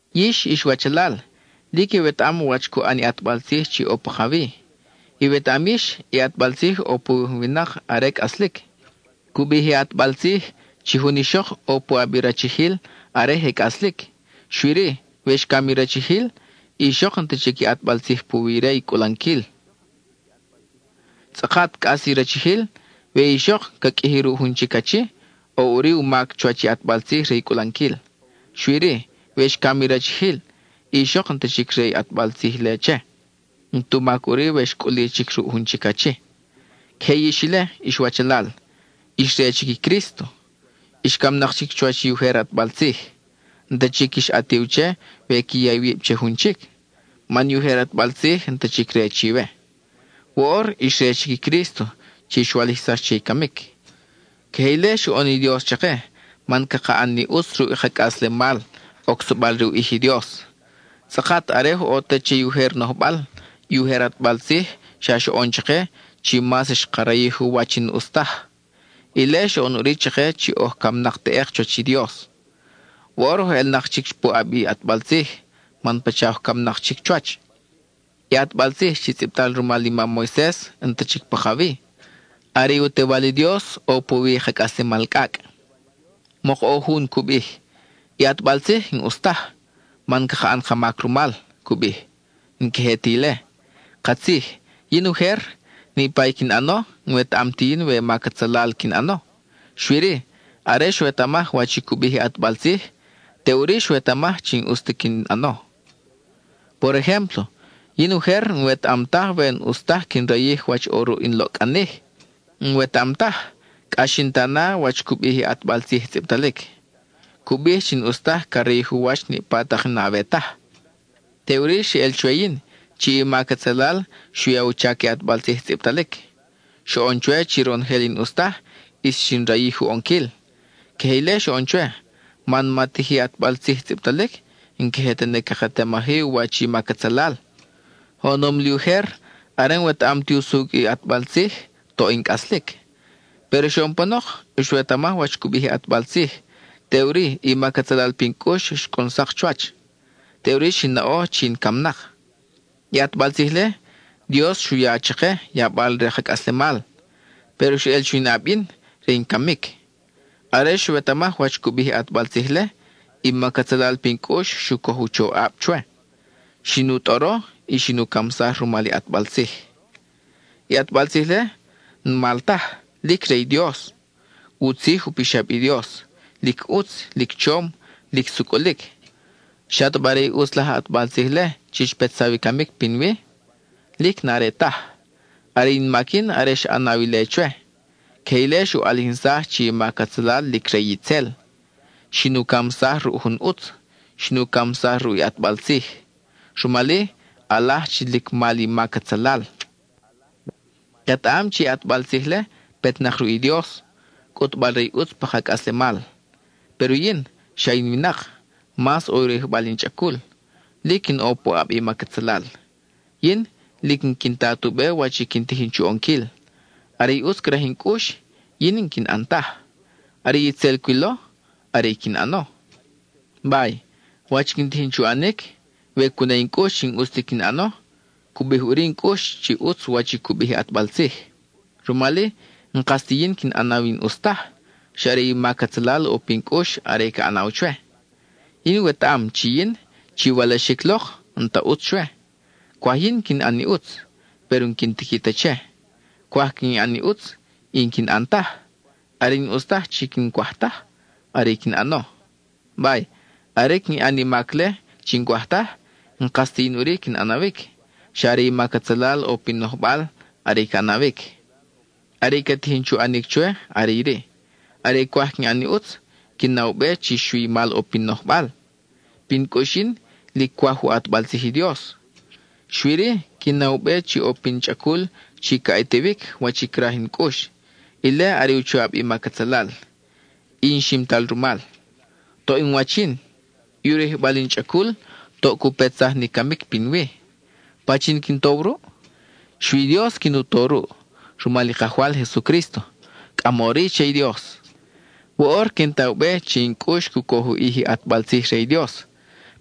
Yix, ix wachalal, lic iwetaʼam wach cu ʼan i ʼatbal tzij chi ʼo pakawi. Iwetaʼam yix, i ʼatbal tzij ʼo puwi jun winak are cʼaslic. Cu bij i ʼatbal tzij chi jun ixok ʼo puʼab i rachijil are je cʼaslic, xui-ri, we xcam i rachijil, i ixok n-ta chic ʼatbal tzij puwi re i cʼulanquil. Tzʼakat cʼas i rachijil, we i ixok ca qʼuiji ruʼ jun chic achi, ʼo ʼuri u mac chuwach i ʼatbal tzij re i cʼulanquil. Xui-ri, we xcam i rachijil, i ixok n-ta chic re i ʼatbal tzij-le che; n-tu mac ʼuri we xcʼuli chic ruʼ jun chic achi. Queje yix ile, ix wachalal, ix re chic i Crísto. Ix camnak chic chuwach i ujer ʼatbal tzij. N-ta chic quix ʼatiw che we qui ya iwib che jun chic, man i ujer ʼatbal tzij n-ta chic re chiwe. Woʼor ix re chic i Crísto chi xwalijsax che i camic. Queje ile xoʼon i Dios chake, man caka ʼan ni ʼutz ruʼ ka cʼaslemal, ocsabal re u ʼij i Dios. Tzʼakat are oj ʼo te che i ujer nojbal, i ujer ʼatbal tzij xa xoʼon chake chi mas xka rayij u wach i n-ʼus taj. Ile xoʼon ʼuri chake chi oj camnak teʼek chuwach i Dios. Woʼor oj elnak chic puʼab i ʼatbal tzij man pacha oj camnak chic chuwach. I ʼatbal tzij chi tzʼibtal rumal i mam Moises n-ta chic pakawi. Are i u Tewal i Dios ʼo puwi i ka cʼaslemal cʼacʼ. Mok ʼo jun cu bij: “I ʼatbal tzij n-ʼus taj, man caka ʼan ka mac rumal,” cu bij. ¡N-queje ta ile! Katzij, yin ujer, niʼpa i quin ʼano, n-wetaʼam ti yin we mac atzalal quin ʼano; xui-ri are xwetamaj wach i cu bij i ʼatbal tzij, teʼuri xwetamaj chi n-ʼus ta quin ʼano. Por ejémplo, yin ujer n-wetaʼam taj we n-ʼus taj quin rayij wach ʼo ruʼ in loʼcʼanij. N-wetaʼam taj, cʼa xin ta na wach cu bij i ʼatbal tzij tzʼibtalic; cu bij chi n-ʼus taj ca rayij u wach niʼpa tak i n-awe taj. Teʼuri xeʼel chwe yin, chi i mac atzalal xu ya u chac i ʼatbal tzij tzʼibtalic. Xoʼon chwe chi ronojel i n-ʼus taj, ʼis xin rayij u ʼonquil. Queje ile xoʼon chwe, man ma tiji ʼatbal tzij tzʼibtalic, n-queje tene caketamaj-i u wach i mac atzalal. Oʼonom li ujer, are n-wetaʼam ti usucʼ i ʼatbal tzij, toʼ in cʼaslic. Péro xoʼon panok, xwetamaj wach cu bij i ʼatbal tzij, teʼuri i mac atzalal pin cʼux xcʼun sak chuwach. Teʼuri xin naʼo chi in camnak. I ʼatbal tzij-le, Dios xu ya chake, yabal re ka cʼaslemal. Péro xeʼel chuwi in ʼab yin, re i camic. Are xwetamaj wach cu bij i ʼatbal tzij-le, i mac atzalal pin cʼux xu coj u choʼab chwe, xin u tʼoro, y xin u camsaj rumal i ʼatbal tzij. I ʼatbal tzij-le, n-mal taj, lic re i Dios. U tzij u pixab i Dios, lic ʼutz, lic chom, lic sucʼulic. ¿Xataba are i ʼutz laj ʼatbal tzij-le chi xpetsaw i camic pinwi? Lic n-are taj. Are in mac yin are xa ʼanaw ile chwe; queje ile xu ʼalijinsaj chi i mac atzalal lic re itzel. Xin u camsaj ruʼ jun ʼutz; xin u camsaj ruʼ i ʼatbal tzij. Rumal-i, ʼalaj chi lic mal i mac atzalal. Ketaʼam chi i ʼatbal tzij-le petnak ruʼ i Dios, cʼutbal-re i ʼutz pa ka cʼaslemal. Péro yin, xa in winak, mas ʼo u rayijbal in chʼacul; lic in ʼo puʼab i mac atzalal. Yin, lic n-quin ta tu be wach i quin tijin chu ʼonquil. Are i ʼutz craj in cʼux, yin n-quin ʼan taj. Are i tzel cwilo, are quin ʼano. Bay, wach quin tijin chu ʼanic, we cu na in cʼux chi n-ʼus ti quin ʼano, cu bij ʼuri in cʼux chi ʼutz wach i cu bij i ʼatbal tzij. Rumal-i, n-kas ti yin quin ʼanaw i n-ʼus taj, xa are i mac atzalal ʼo pin cʼux are i ca ʼanaw chwe. Yin wetaʼam chi yin, chi walaxic lok, n-ta ʼutz chwe. Cwaj yin quin ʼan i ʼutz, péro n-quin tiqui ta che. Cwaj quin ʼan i ʼutz, y n-quin ʼan taj; are i n-ʼus taj chi n-cwaj taj, are i quin ʼano. Bay, are quin ʼan i mac-le chi n-cwaj taj, n-kas ti yin ʼuri quin ʼanawic. Xa are i mac atzalal ʼo pin nojbal are i ca ʼanawic. Are i ca tijin chu ʼanic chwe are iri: are cwaj quin ʼan i ʼutz, quin na u be chi xui i mal ʼo pin nojbal. Pin cʼux yin, lic cwaj u ʼatbal tzij i Dios; xui-ri, quin na u be chi ʼo pin chʼacul chi ca ʼatiwic wach i craj in cʼux, ile are i u choʼab i mac atzalal; y in ximtal rumal. Toʼ in wach yin. I u rayijbal in chʼacul toʼ cu petsaj ni camic pinwi. ¿Pachin quin tow ruʼ? Xui i Dios quin u to ruʼ, rumal i Kajwal Jesucrísto, ¡cʼamori che i Dios! Woʼor quin ta u be chi in cʼux cu coj u ʼij i ʼatbal tzij re i Dios,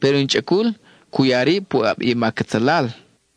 péro in chʼacul cu ya rib puʼab i mac atzalal.